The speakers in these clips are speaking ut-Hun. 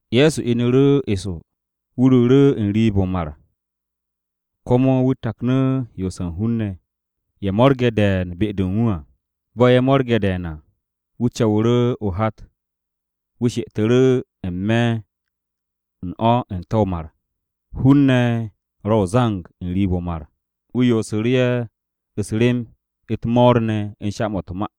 Ye̱so inu̱ru̱ eso, wu̱ ruuru̱ n-riib o̱ o-mar, komo wu̱ taknu̱ yoose̱ u̱n hun-ne̱. Ye̱ mo̱rgu̱ru̱ de̱e̱n be-de u̱n wu̱. Bo̱ ye̱ mo̱rge̱ de̱e̱n à, wu̱ co̱wu̱ru̱ o-hat wu̱ she'etu̱ru̱ n-me̱ u̱n o̱ n-te̱ o-mar. Hun-ne̱ ro̱ o-zang n-riib o̱ o-mar. Wu̱ yoosu̱ru̱ ye̱ u̱s-rem u̱t-mo̱o̱r ne̱ u̱n sha-mo̱ u̱t-ma.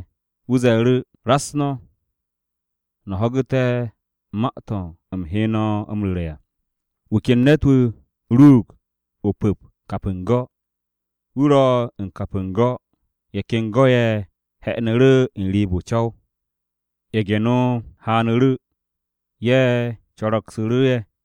Wu̱ ze̱e̱ru̱, “Raks no̱, no̱ ho̱gu̱te̱ ma-to̱ u̱m he no̱ m-ru̱re̱ à. Wu̱ ken ne̱t-wu̱ ruug o-pu̱p kap u̱n go̱. Wu̱ ro̱ u̱n kap u̱n go̱, ye̱ ken go̱-ye̱ he̱'e̱nu̱ru̱ n-riib n-co̱w. Ye̱ge̱-no haanu̱ru̱, ye̱ co̱ro̱gsu̱ru̱ ye̱.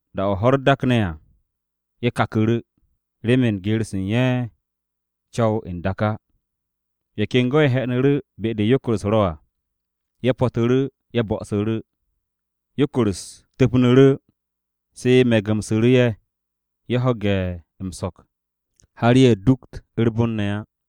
Da-o̱ ho̱-u̱r dakne̱ à, ye̱ kaku̱ru̱, remen geer-se u̱n ye̱ co̱w n-dak á. Ye̱ ken go̱-ye̱ he̱'e̱nu̱ru̱ be-de yokor-u̱s ro̱ à. Ye̱ po̱tu̱ru̱, ye̱ bo̱'o̱su̱ru̱. Yokor-u̱s tu̱pnu̱ru̱, se me̱gu̱msu̱ru̱ ye̱, ye̱ ho̱ge̱ m-so̱k har ye̱ du̱kt u̱r-bon ne̱ á.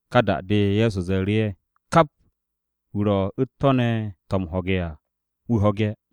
Ka da-de, Ye̱so ze̱e̱ru̱ ye̱, “Kap wu̱ ro̱ u̱t-to̱ ne̱ to̱ m-ho̱ge̱ à, wu̱ ho̱ge̱.”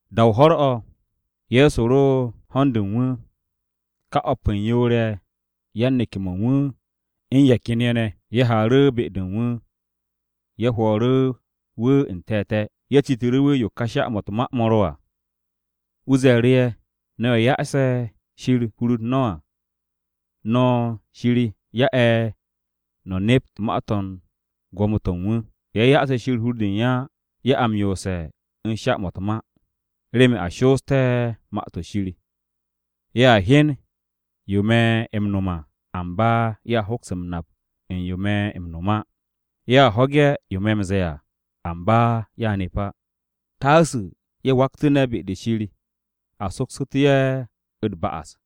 Da-o ho̱r-o̱, Ye̱so ro u̱n ho̱n-de u̱n wu̱. Ka o̱p u̱n yoor-ye̱, yan-neke̱-mo̱ u̱n wu̱, u̱n ye̱ ken ye̱ ne̱, ye̱ haaru̱ be-de u̱n wu̱ ye̱ hwo̱o̱ru̱ wu̱ n-te̱te̱. Ye̱ citu̱ru̱ wu̱ yo ka sha-mo̱ u̱t-ma to̱ ro̱ à. Wu̱ ze̱e̱ru̱ ye̱, “No̱ ye̱ ya'ase̱ Shir hur-u̱r no̱ à, no̱ ye̱ Shir ya'e̱ no̱ nept ma-to̱ u̱n gwo̱mo-to̱ u̱n wu̱. Ye̱ ya'ase̱ Shir hur-de u̱n ye̱ á, ye̱ a m-yoose̱ u̱n sha-mo̱ u̱t-ma. Remen a shoosté̱ Ma-to̱ Shir: “ ‘Ye̱a hyen yo me̱ m-no̱m à amba ye̱a hoks m-nap u̱n yo̱ me̱ m-no̱m á. Ye̱a ho̱ge̱ yo me̱ m-ze̱e̱ à, amba ye̱a nep á; taasu̱ ye̱ waktu̱ne̱ be-de Shir a soksu̱te̱ ye̱ u̱t-ba'as.’”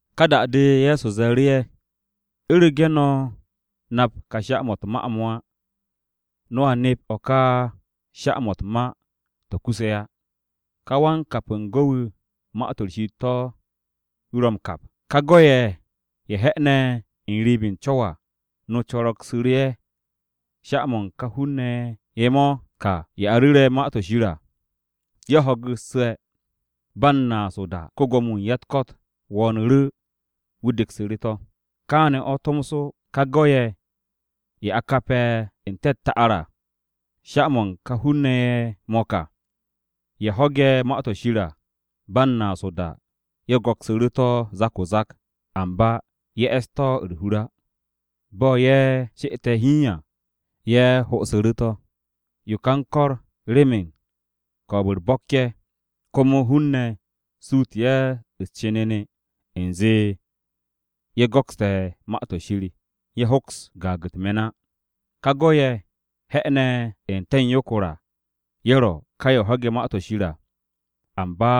Ka da-de, Ye̱so ze̱e̱ru̱ ye̱, “U̱rege̱ no̱ nap ka sha-mo̱ u̱t-ma to̱ á, no̱a nep o̱ ka sha-mo̱ u̱t-ma to̱ kusse̱ á. Ka wan-kap u̱n go̱ wu̱, Ma-to̱ Shir to̱ wu̱ ro̱ m-kap. Ye̱ ka go̱-ye̱ ye̱ he̱'e̱ne̱ n-riib u̱n co̱w à, no co̱ro̱gsu̱ru̱ ye̱, sha-mo̱ u̱n ka hun-ne̱ ye̱ mo̱ ka, ye̱ a ru̱re̱ Ma-to̱ Shir à. Ye̱ ho̱gu̱sse̱, ba u̱n naas o-da, ko-Gwo̱mo-wu̱ u̱n ya-u̱t-ko̱t wo̱o̱nu̱ru̱, wu̱ deksu̱ru̱ to̱. Kaane̱ o̱ tomso, ka go̱-ye̱, ye̱ a kape̱ n-te̱ u̱t-ta'ar à, sha-mo̱ u̱n ka hun-ne̱ ye̱ mo̱ ka, ye̱ ho̱ge̱ Ma-to̱ Shir à. Ba u̱n naas o-da, ye̱ go̱ksu̱ru̱ to̱ o-zak o-zak. Amba ye̱ e̱ss to̱ u̱r-hur á. Bo̱ ye̱ she'ette̱ hiin à, ye̱ ho'osu̱ru̱ to̱. Yo ka u̱n ko̱r remen ko̱o̱b-u̱r bo̱k ye̱, komo hun-ne̱ suutu̱ ye̱ u̱s-cenene u̱nze ye̱ go̱kste̱ Ma-to̱ Shir, ye̱ hoks gaag u̱t-me̱n á. Ka go̱-ye̱, he̱'e̱ne̱ n-te̱ u̱n yokor à, ye̱ ro̱ ka ye̱ ho̱ge̱ Ma-to̱ Shir à. Amba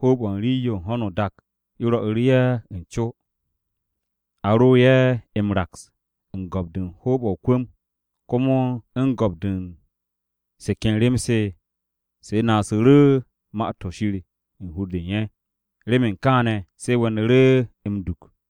hoob-o̱ u̱n rii-yo u̱n ho̱no o-dak yo rwo̱'u̱ru̱ ye̱ u̱n co. A ro̱ ye̱ m-raks u̱n go̱p-de u̱n hoob-o̱ o-kwu̱m. Komo u̱n go̱p-de u̱n se ken rem-se, se naasu̱ru̱ Ma-to̱ Shir u̱n hur-de u̱n ye̱. Remen kaane̱, se we̱nu̱ru̱ m-duk.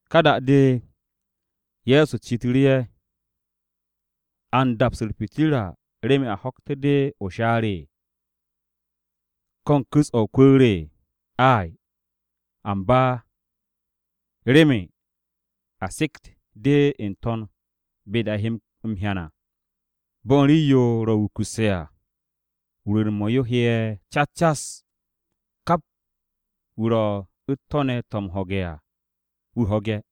Ka da-de, Ye̱so citu̱ru̱ ye̱, “¿A u̱n daps u̱r-pitirra remen a ho̱kte̱ de o-shaar? ¿Ko̱ u̱n ku̱s-o̱ o-kwu̱u̱r? Ay, amba remen a sekt de n-to̱n be-de a he m-hyan à. Bo̱ u̱n rii-yo ro̱ wukusse̱ à, rwu̱u̱n-mo̱ yo he'e̱ cas cas. Kap wu̱ ro̱ u̱t-to̱ ne̱ to̱ m-ho̱ge̱ à, wu̱ ho̱ge̱.”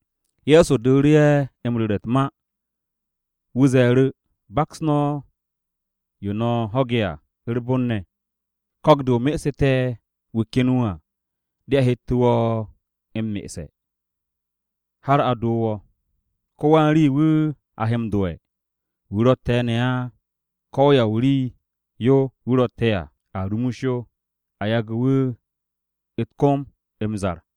Ye̱so dooru̱ ye̱ m-ru̱re̱ u̱t-ma. Wu̱ ze̱e̱ru̱, “Baks no̱ yo no̱ ho̱ge̱ à u̱r-bon ne̱. Ko̱k-de o mesu̱te̱ wu̱ ken wu̱ à de a hette̱ wo̱ m-me'esse̱, har a doo wo̱. Ko-wan-rii, wu̱ a m-do'e̱. Wu̱ ro̱tte̱ ne̱ á, ko̱ ya o-rii-yo yo wu̱ ro̱tte̱ hiin à, a rumus yo, a yage̱ wu̱ u̱t-kom m-zar.”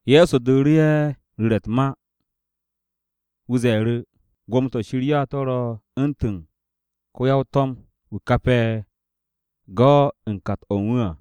Ye̱so dooru̱ ye̱ u̱n ru̱re̱ u̱t-ma. Wu̱ ze̱e̱ru̱, “Gwo̱mo-to̱ Shir ya to̱ ro̱ u̱ntu̱n ko-ya-to̱m wu̱ kape̱ go̱ u̱n kat-o̱ u̱n wu̱ à.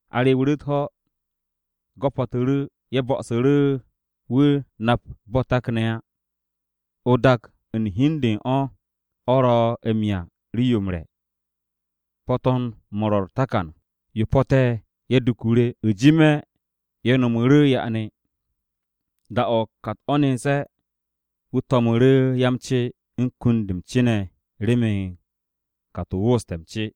A rewu̱ru̱ u̱t-ho̱, go̱ po̱tu̱ru̱, ye̱ bo̱'o̱su̱ru̱, wu̱ nap bo̱ takne̱ á. O-dak u̱n hi u̱n de u̱n o̱, o̱ ro̱ m-'ya rii-yo m-re̱. Po̱to̱n-mo̱ ro̱ u̱r-takan. Ye̱ po̱te̱, ye̱ duku̱ru̱. U̱jime̱ ye̱ no̱mu̱ru̱ ya'ane. Da-o̱ kat-o̱ nense̱, wu̱ to̱mu̱ru̱ ya-m-ce u̱n kunt-de m-ce ne̱ remen kat-o wooste̱ m-ce.”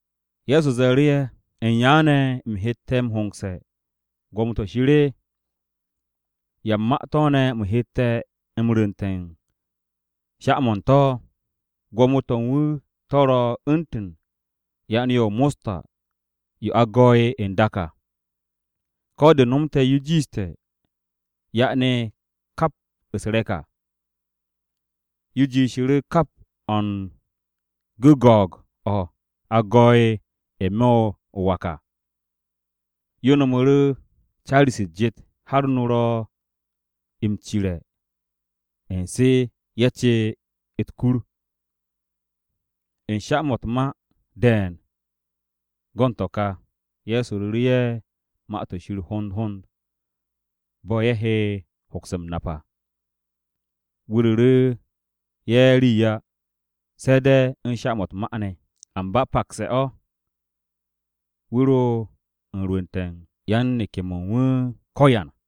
Ye̱so ze̱e̱ru̱ ye̱, “¿U̱n yaane̱ u̱m hette̱ m-hongse̱ Gwo̱mo-to̱ Shir? ¿Ya u̱n ma-to̱ ne̱ u̱m hette̱ m-rwu̱nte̱ u̱n sha-mo̱ u̱n to̱? Gwo̱mo-to̱ u̱n wu̱ to̱ ro̱ u̱ntu̱n ya'ane-yo o-mosta yo a go̱'e̱ n-dak à. Ko̱ de nomte̱ yo jiishte̱ ya'ane kap u̱s-re̱k à. Yo jiishu̱ru̱ kap o̱ u̱n gu̱go̱o̱g-o̱, a go̱'e̱ n-me̱ o-wak à. Yo no̱mu̱ru̱ caari-se u̱s-jet, har no ro̱ m-cire̱ u̱n se ye̱ ce u̱t-kur.” U̱n sha-mo̱ u̱t-ma de̱e̱n go̱n to̱ ka, Ye̱so ru̱re̱ ye̱ Ma-to̱ Shir hond hond bo̱ ye̱ he hoks m-nap à. Wu̱ ru̱ru̱ ye̱ rii á, se̱ de̱ u̱n sha-mo̱ u̱t-ma ne̱. Amba pakse̱ o̱, wu̱ ro u̱n rwu̱nte̱ u̱n yan-neke̱-mo̱ u̱n wu̱ ko̱yan.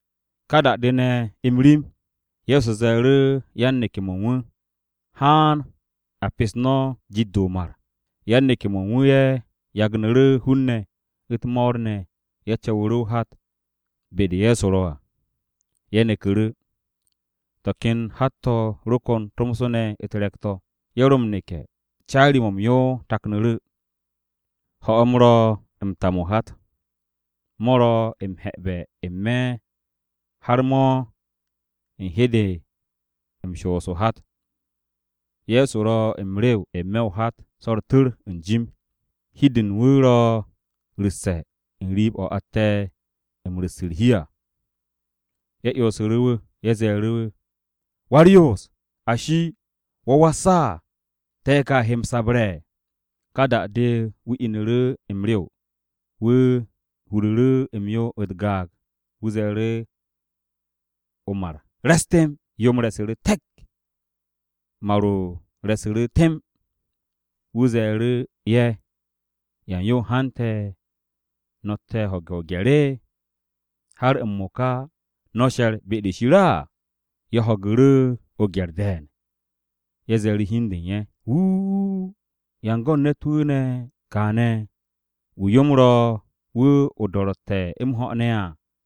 Ka da-de ne̱ m-rim, Ye̱so ze̱e̱ru̱ yan-neke̱-mo̱ u̱n wu̱, “Haan a pes no̱ jit-de o-mar.” Yan-neke̱-mo̱ u̱n wu̱ ye̱ yagnu̱ru̱ hun-ne̱, u̱t-mo̱o̱r ne̱ ye̱ co̱wu̱ru̱ o-hat be-de Ye̱so ro à. Ye̱ neku̱ru̱. To̱ ken hat-to̱ ro kon tomso ne̱ u̱t-re̱k-to̱. Ye̱ ro m-neke̱, caari-mo̱ m-yo taknu̱ru̱. Ho̱-m ro m-tam o-hat. Mo̱ ro m-he̱'e̱be̱ n-me̱ har mo̱ u̱n he de m-shoos o-hat. Ye̱so ro m-rew n-me̱ o-hat so u̱r-tu̱r u̱n jim. Hi-de u̱n wu̱ ro ru̱sse̱ u̱n rii-o̱ atte̱ u̱n ru̱s u̱r-hi à. Ye̱ 'yonsu̱ru̱ wu̱. Ye̱ ze̱e̱ru̱ wu̱, “Wa-u̱r-Yoos, ashi! ¿Wo̱ was á? Te̱ ka he m-sabarse̱!” Ka da-de, wu̱ inu̱ru̱ m-rew, wu̱ huru̱ru̱ m-yo u̱t-gaag. Wu̱ ze̱e̱ru̱ o-mar, “Re̱s temb.” Yo-m re̱su̱ru̱ te̱k. Mar-o re̱su̱ru̱ temb. Wu̱ ze̱e̱ru̱ ye̱, “¿Yan yo hante̱ no̱tte̱ u̱n ho̱ge̱ o-gye̱r? ¿Har m-mo̱ka no̱ she̱r be-de Shir á?” Ye̱ ho̱gu̱ru̱ o-gye̱r de̱e̱n. Ye̱ ze̱e̱ru̱ hi u̱n de u̱n ye̱, “Wuuu, ¿Ya u̱n go̱n ne̱t-wu̱ kaane̱ wu̱ yo-m ro̱ wu̱ o-do̱ro̱tte̱ m-ho̱ ne̱?”